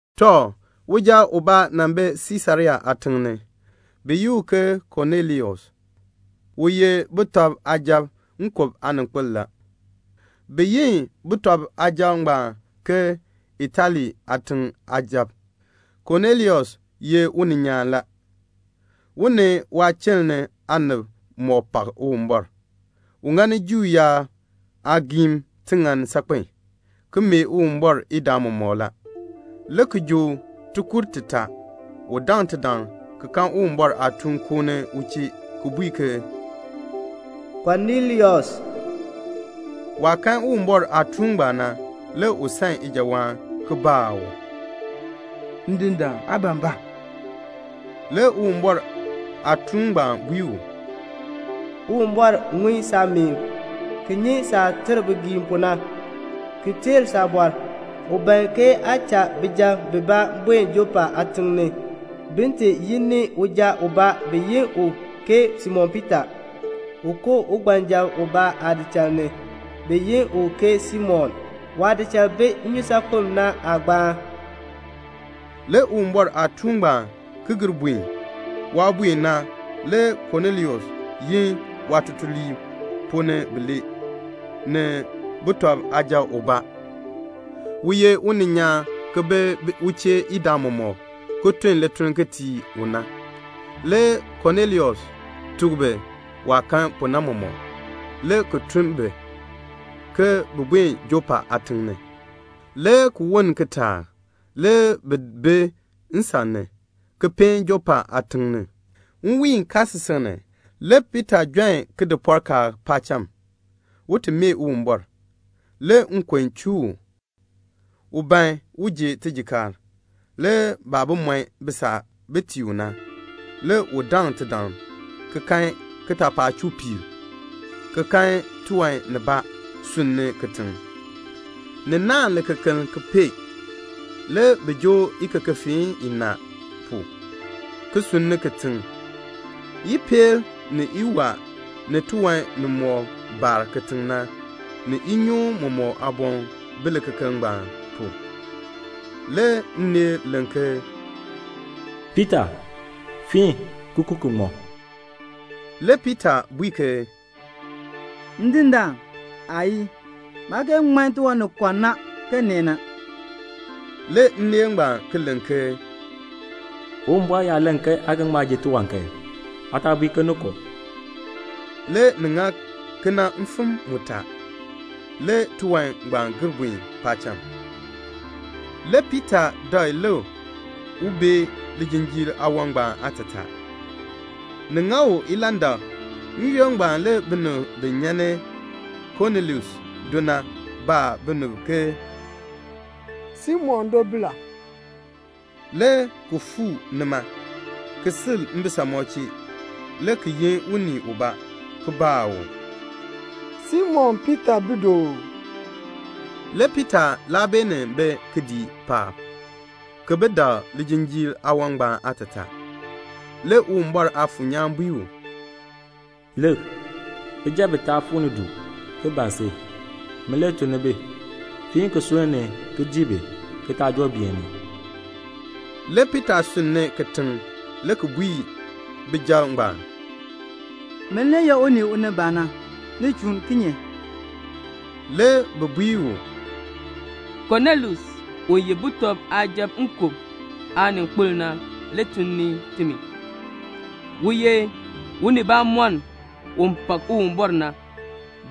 Tɔ, uja ubaa nan bi Siisarea aatiŋ ni, bi yi u ke Konelius. U ye sujatiib nkub aaninkpil la. Bi yi sujatiib ngbaan ke "Itali aatiŋ aasujatiib." Konelius ye uninyaan la. U ni waachiln ni aanib mɔk pak Uwumbɔr. U ŋani Juu yaab aagiim tiŋann saakpen, ki mee Uwumbɔr idaa mɔmɔk la. Le kijook tikur titaa u daŋ tidaŋ ki kan Uwumbɔr aatuun koo ni u chee ki bui ke "Konelius." Waah kan Uwumbɔr aatuun ngbaan na, le u san ijawaan, ki baa u, "Ndindaan, aa ban ba?" Le Uwumbɔr aatuun ngbaan bui u, "Uwumbɔr ŋun saameen, ki nyi saah ter bigiim pu na, ki teer saabɔr. U ban ke aa cha bijab bibaa buen Jɔpa aatiŋ ni, bin ti yi ni uja ubaa bi yi u ke Simon Piita. U koo ugbanjab ubaa aadichal ni, bi yi u ke Simon. Waadichal bi nnyusaakpem na aagbaan." Le Uwumbɔr aatuun ngbaan ki gir buen. Waah buen na, le Konelius yin waatutuliib ponn ni bilee, ni suja ubaa u ye uninyaan ki bi u chee idaa mɔmɔk ki tun lituln ki tii u na. Le Konelius tuk bi waah kan pu na mɔmɔk, le ki tun bi, ke bin buen Jɔpa aatiŋ ni. Le ki woln kitaak, le bi bi nsan ni, ki peen Jɔpa aatiŋ ni. Nwiin kaasisik ni, le Piita jon kidipɔrkaan paacham, un ti mee Uwumbɔr. Le nkon chuu u. U ban un ji tijikaar. Le baah bi mɔn bisaa bin tii u na, le u daŋ tidaŋ ki kan kitaapaak chuu piir, ki kan tiwan nibaa sunni kitiŋ. Ni naahn likekeln ki pee. Le bi joo ikekefeen inaa pu, ki sunni kitiŋ. Ipeel, ni iwaa, ni tiwan nimɔk baar kitiŋ na, ni inyoon mɔmɔk aaboŋ bi likekeln ngbaan pu. Le nneel len ke, "Piita, fiin, ki ku ki ŋmɔ." Le Piita bui ke, "Ndindaan, aayii. Maa kee ŋman tiwan ni kɔ na, ke nee na." Le nneel ngbaan ki len ke, "Uwumbɔr yaa len ke aa ga ŋma ji tiwan kan, aa taa bui ke ni kɔ." Le ni ŋa kena mfim mutaa. Le tiwan ngbaan gir buen paacham. Le Piita dak lik un bee lijinjiir aawan ngbaan aatataa. Ni ŋa u ilandak la. N-yoonn ngbaan le binib bi nyan ni Konelius do na baa binib ke "Simon do bi la?" le ki fuu nima, le ki sil mbisamɔb chee, le ki yin unii ubaa, le ki baa u, "Simon Piita bi du uu?" Le Piita laa beenin bi kidiik paab, ki bi dak lijinjiir aawan ngbaan aatataa. Le Uwumbɔr Aafuur nyaan bui u, "Lik, bijab bitaa fuu ni du, ki ban si. Min le tun ni bi. Fiin ki sunn ni, ki dii bi, ki taa joo beeni." Le Piita sunn ni kitiŋ le ki bui bijab ngbaan, "Min le ye unii u ni ban na. Ni chuun kinye?" Le bi bui u, "Konelius, u ye sujatiib nkub aaninkpil na le tun ni timi. U ye unibamɔnn u pak Uwumbɔr na.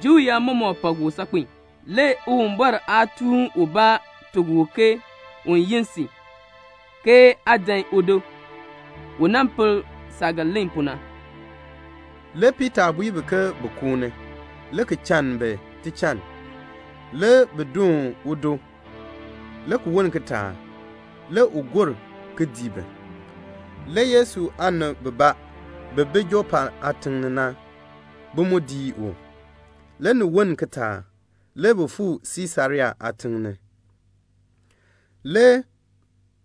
Juu yaab mɔmɔk pak u saakpen a. Le Uwumbɔr aatuun ubaa tuk u ke un yin si, ke aa dan udo, u nan pel saah ga len pu na." Le Piita bui bi ke bin koo ni, le ki chann bi tichann. Le bi doon udo. Le ki woln kitaak, le u gor ki dii bi. Le Yesu aanib bibaa bi bi Jɔpa aatiŋ ni na, bi mu dii u. Le ni woln kitaak, le bi fuu Siisarea aatiŋ ni. Le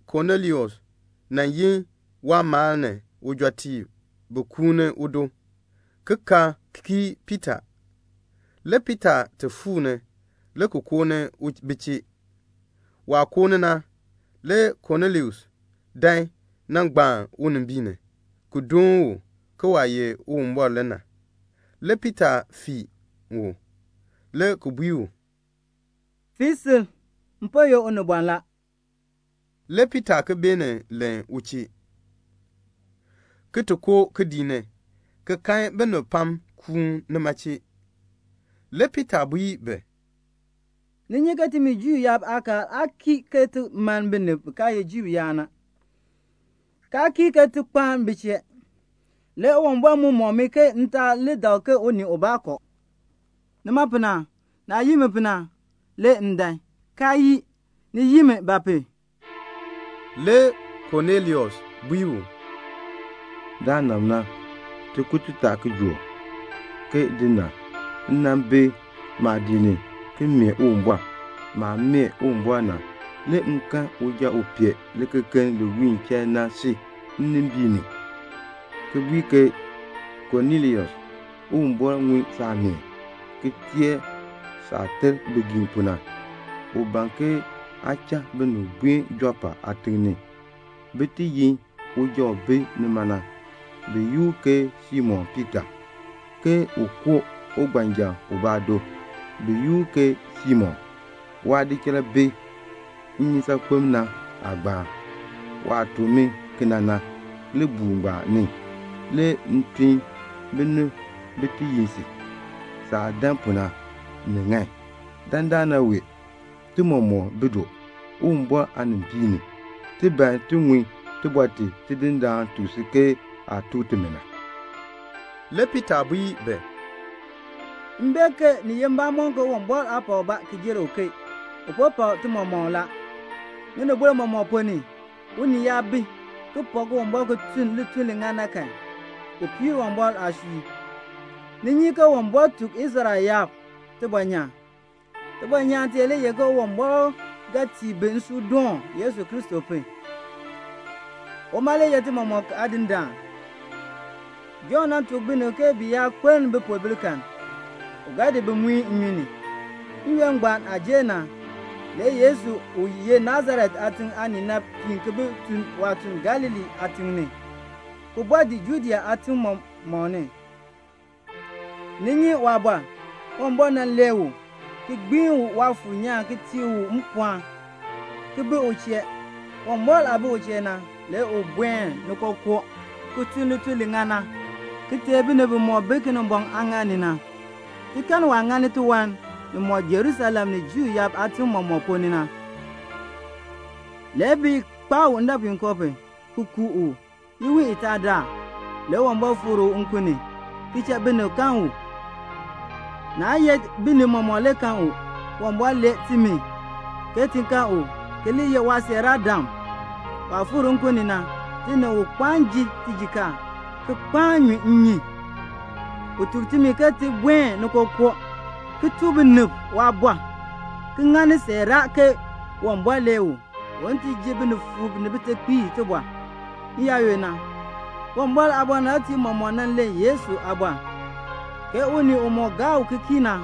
Konelius nan yin waamaal ni ujɔtiib bin kuuni udo, ki ka kii Piita. Le Piita ti fuu le ki koo ni bi chee. Waah koo ni na, le Konelius dan nan gbaan unimbiin ni, ki doon u, ke waah ye Uwumbɔr le na. Le Piita fiin u, le ki bui u, "Fii sil. M po ye unibɔn la." Le Piita ki beenin len u chee, ki ti koo kidiik ni, ki kan binib pam kuun nima chee. Le Piita bui bi, "Ni nyi ke timi Juu yaab aakaal aa kii ke ti mann binib bi kaa ye Juu yaab na, kaa kii ke ti kpaan bi chee. Le Uwumbɔr mu mɔk mi ke m taa li dak ke unii ubaa kɔ. Nima pu na, naah yin mi pu na, le m dan, kaa yii. Ni yin mi ba pu?" Le Konelius bui u, "Daanab na, tikur titaa kijook, ke din na, m nan bi maadiik ni, ki mee Uwumbɔr. Maah mee Uwumbɔr na, le m kan uja u pee likekeln li wiin chain na si nnimbiin ni ki bui ke, 'Konelius, Uwumbɔr ŋun saameen, ki teer saah ter bigiim pu na. U ban ke aa cha binib buen Jɔpa aatiŋ ni, bin ti yin uja u bi nima na, bi yi u ke Simon Piita, ke u koo ugbanjab ubaa do, bi yi u ke Simon. Waadichal bi nnyusaakpem na aagbaan.' Waah tuk mi kena na, libuul ngbaan ni le m tun binib bin ti yin si. Saah dan pu na, ni ŋan. Dandana wee, ti mɔmɔk bi du, Uwumbɔr aanimbiin ni. Ti ban ti ŋun tibɔr ti Tidindaan tuk si ke aa tuk timi na." Le Piita bui bi, "M bee ke ni ye mbamɔn ke Uwumbɔr aa pak ubaa ki jer uken. U po pak ti mɔmɔk la. Ŋinibol mɔmɔk ponn ni, unii yaa bi, ki pak Uwumbɔr ki tun lituln li ŋan na kan, u piir Uwumbɔr aasui. Ni nyi ke Uwumbɔr tuk Israel yaab tibɔnyaan. Tibɔnyaan tee le ye ke Uwumbɔr ga tii bi nsuudoon Yesu Kristo pu, u ye ti mɔmɔk Aadindaan. Jɔnn nan tuk binib ke bi yaa kpeln bipoobil kan, u ga di bi ki muin bi nnyun ni. N-yoonn ngbaan aah jer na, le Yesu u ye Nasaret aatiŋ aanii na piin ki bi tun waatuln Galilee aatim ni, ki bɔɔ dii Judea aatim mɔmɔk ni. Ni nyi waabɔr. Uwumbɔr nan lee u, ki gbiin u Waafuur nyaan ki tii u mpɔɔn, ki bi u chee. Uwumbɔr aah bi u chee na, le u buen ni kookoo, ki tun lituln li ŋan na, ki teei binib bimɔk nan bi Kinimbɔŋ aaŋaal ni na. Ti kan waah ŋani tiwan nimɔk na Jerusalem ni Juu yaab aatim mɔmɔk ponn ni. Le bi kpaa u ndɔpuinkoo pu, ki ku u. Iwiin itaa daal, le Uwumbɔr fikr u nkun ni, ki cha binib kan u. Naa ye binib mɔmɔk le kan u. Uwumbɔr lee timi, ke ti kan u, ki li ye waasiiraadam. Waah fikr nkun ni na, ti ni u kpaan ji tijikaar, ki kpaan ki nyu nnyun. U tuk timi ke ti buen ni kookoo, ki ti tuk binib waabɔr, ki ŋani siiraa ke Uwumbɔr lee u, un ti ji binifuub ni bitekpiib tibɔr. N-yaayoonn na, Uwumbɔr aabɔnabtiib mɔmɔk nan len Yesu aabɔr, ke unii umɔk gaa u ki kii na,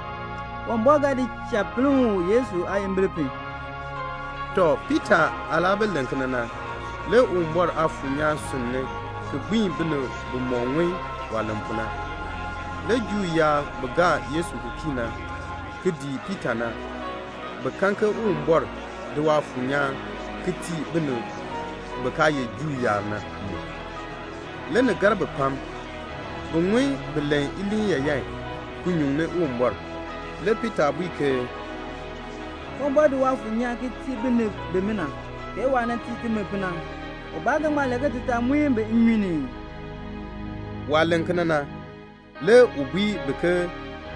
Uwumbɔr ga di cha pinn u Yesu aayimbil pu." Tɔ, Piita aah laa bi len kena na, le Uwumbɔr Aafuur nyaan sunn ni ki gbiin binib bimɔk ŋun waah len pu na. Le Juu yaab bi gaa Yesu ki kii na ki dii Piita na, bi kan ke Uwumbɔr di Waafuur nyaan ki tii bin kaa ye Juu yaab na mu. Le ni gar bi pam. Bi ŋun bi len iliin yaayan ki nyuŋni Uwumbɔr. Le Piita bui ke, "Uwumbɔr di Waafuur nyaan ki tii binib bimina, ke waah tii timi pu na. Ubaa ga ŋma len ke ti taa muin bi nnyun ni ii?." Waah len kena na, le u bui bi ke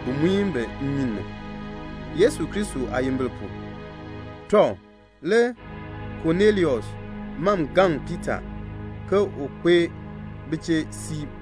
bin di bi ki muin bi nnyun ni, Yesu Kristo aayimbil pu. Tɔ, le Konelius mam gaŋ Piita ke un kpee bi chee siib.